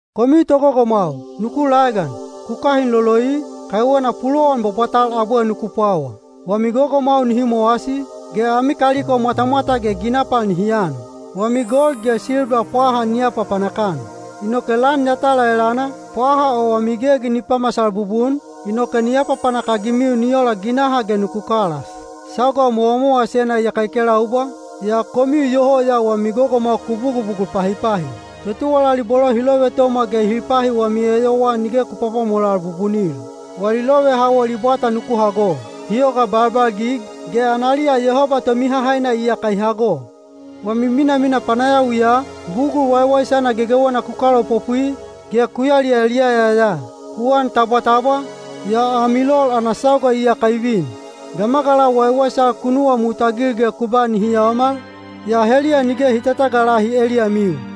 Komiu togogomwau, nuku laegan. Ku kahin loloi, kaiwena pulowan bwabwatal abwe nuku pwawa. Wami gogomwau nihi mowasi, ge ami kaliko mwatamwata ge ginapal nihi an. Wami gold ge silba pwaha ni apapanak-an. Inoke lan yatala elana, pwaha o wami gegi ni pamasal bubun, inoke ni apapanak-agimiu ni ola ginaha ge nuku kalas. Sauga mowamowasena iyaka i kelaubwa, yaa komiu iyoho ya wami gogomwau ku bugubugul pahipahi. Totuwalali bolo hi lovetomwa ge hi pahi wami eyowaa nige ku pwapwamolal bubunil. Wali lovehawol i bwata nuku hago. Hi yoga balbalgig, ge analiya Yehoba Tomihahaina iyaka i hago. Wami minamina panayawiya, bugul waiwaisana gegewena ku kalaopopwi, ge ku yaliyaliyaya ya. Ku an tabwatabwa, yaa ami lol ana sauga iyaka i vin. Gamagalau waiwaisal ku nuwamutagil ge ku ba nihi yaomal, yaa heliya nige hi tatagalahi eliyamiu.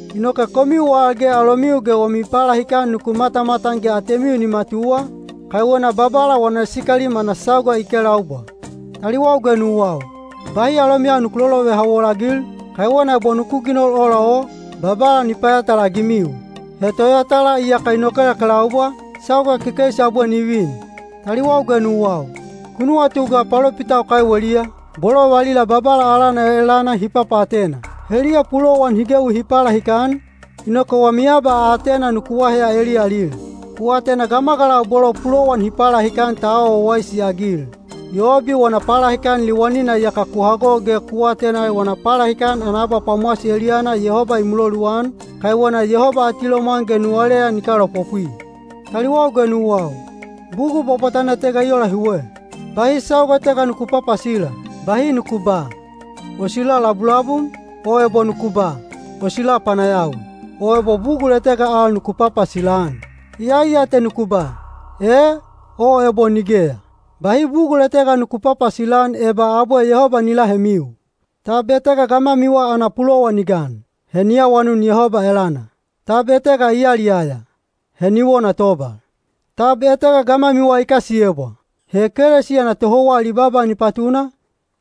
Inoke komiu al ge alomiu ge wami palahikan nuku matamatan ge atemiu ni matuwa, kaiwena Babala wana sikalim ana sauga i kelaubwa. Taliwau ge nuwau, bahi alomiyau nuku lolovehawol-agil, kaiwena ebo nuku ginol ola o, Babala ni payatala-agimiu. He Toyatala iyaka i nokelakelaubwa, sauga kekeisi abwe ni vin. Taliwau ge nuwau, ku nuwatu ga palopitau kaiweliya, bolo valila Babala alana elana hi papaatena. Heliya pulowan hi gewi hi palahikan, inoke wami abaatena nuku aheya eliyalil. Ku atena gamagalau bolo pulowan hi palahikan ta awa wawaisi-agil. Yobi wana palahikan liwanina iyaka ku hago ge ku atena wana palahikan ana abapwamowasi eliyana Yehoba i muloluan, kaiwena Yehoba atilomwan ge nuwaleyan i kalaopopwi. Taliwau ge nuwau, bugul bwabwatana etega i ola hiwe. Bahi sauga etega nuku papasila. Bahi nuku ba, “O sila labulabum,” o ebo nuku ba, “O sila panayawi,” o ebo bugul etega al nuku papasila-an. Iyai ya te nuku ba, “E” o ebo “Nigeya.” Bahi bugul etega nuku papasila-an eba abwe Yehoba ni lahemiu. Tab etega gamwamiwa ana pulowan i gan? He ni awanun Yehoba elana. Tab etega i yaliyaya? He ni wona tobal. Tab etega gamwamiwa i kasiyebwa? He ekelesiya ana tohouwa ali baaba ni patuna,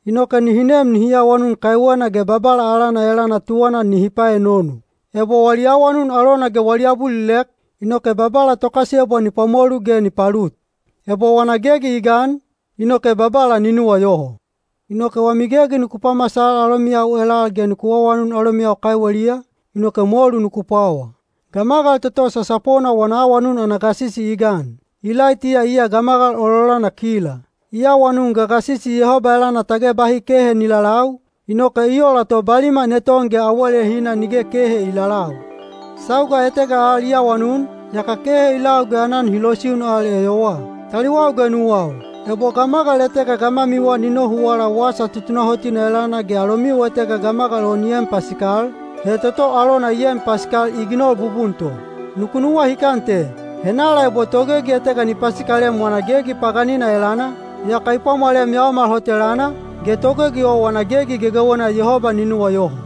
inoke nihi nem nihi awanun kaiwena ge Babala alana elana tuwana nihi paenonu. Ebo wali awanun alona ge wali abulilek, inoke Babala tokasiyebwa ni pwamolu ge ni palut. Ebo wana gegi i gan, inoke Babala ni nuwayoho. Inoke wami gegi nuku pamasal alomiyau elal ge nuku awanun alomiyau kaiweliya, inoke molu nuku pwawa. Gamagal toto sasapona wana awanun ana gasisi i gan. Ilaitiya iya gamagal ololana kila. I awanun gagasisi Yehoba elana tage bahi kehe ni lalau, inoke i ola to baliman eton ge awalehina nige kehe i lalau. Sauga etega al i awanun, yaka kehe i lau ge aanan hi losiun al eyowaa. Taliwau ge nuwau, ebo gamagal etega gamwamiwa ni nohuwala wasa tutunahotina elana ge alomiu etega gamagal o ni en pasikal, he toto alona i en pasikal i ginol bubun to. Nuku nuwahikan te: henala ebo togegi etega ni pasikalem wana gegi paganina elana, yaka i pwamwalem yaomal hot elana, ge togegi o wana gegi gegewena Yehoba ni nuwayoho.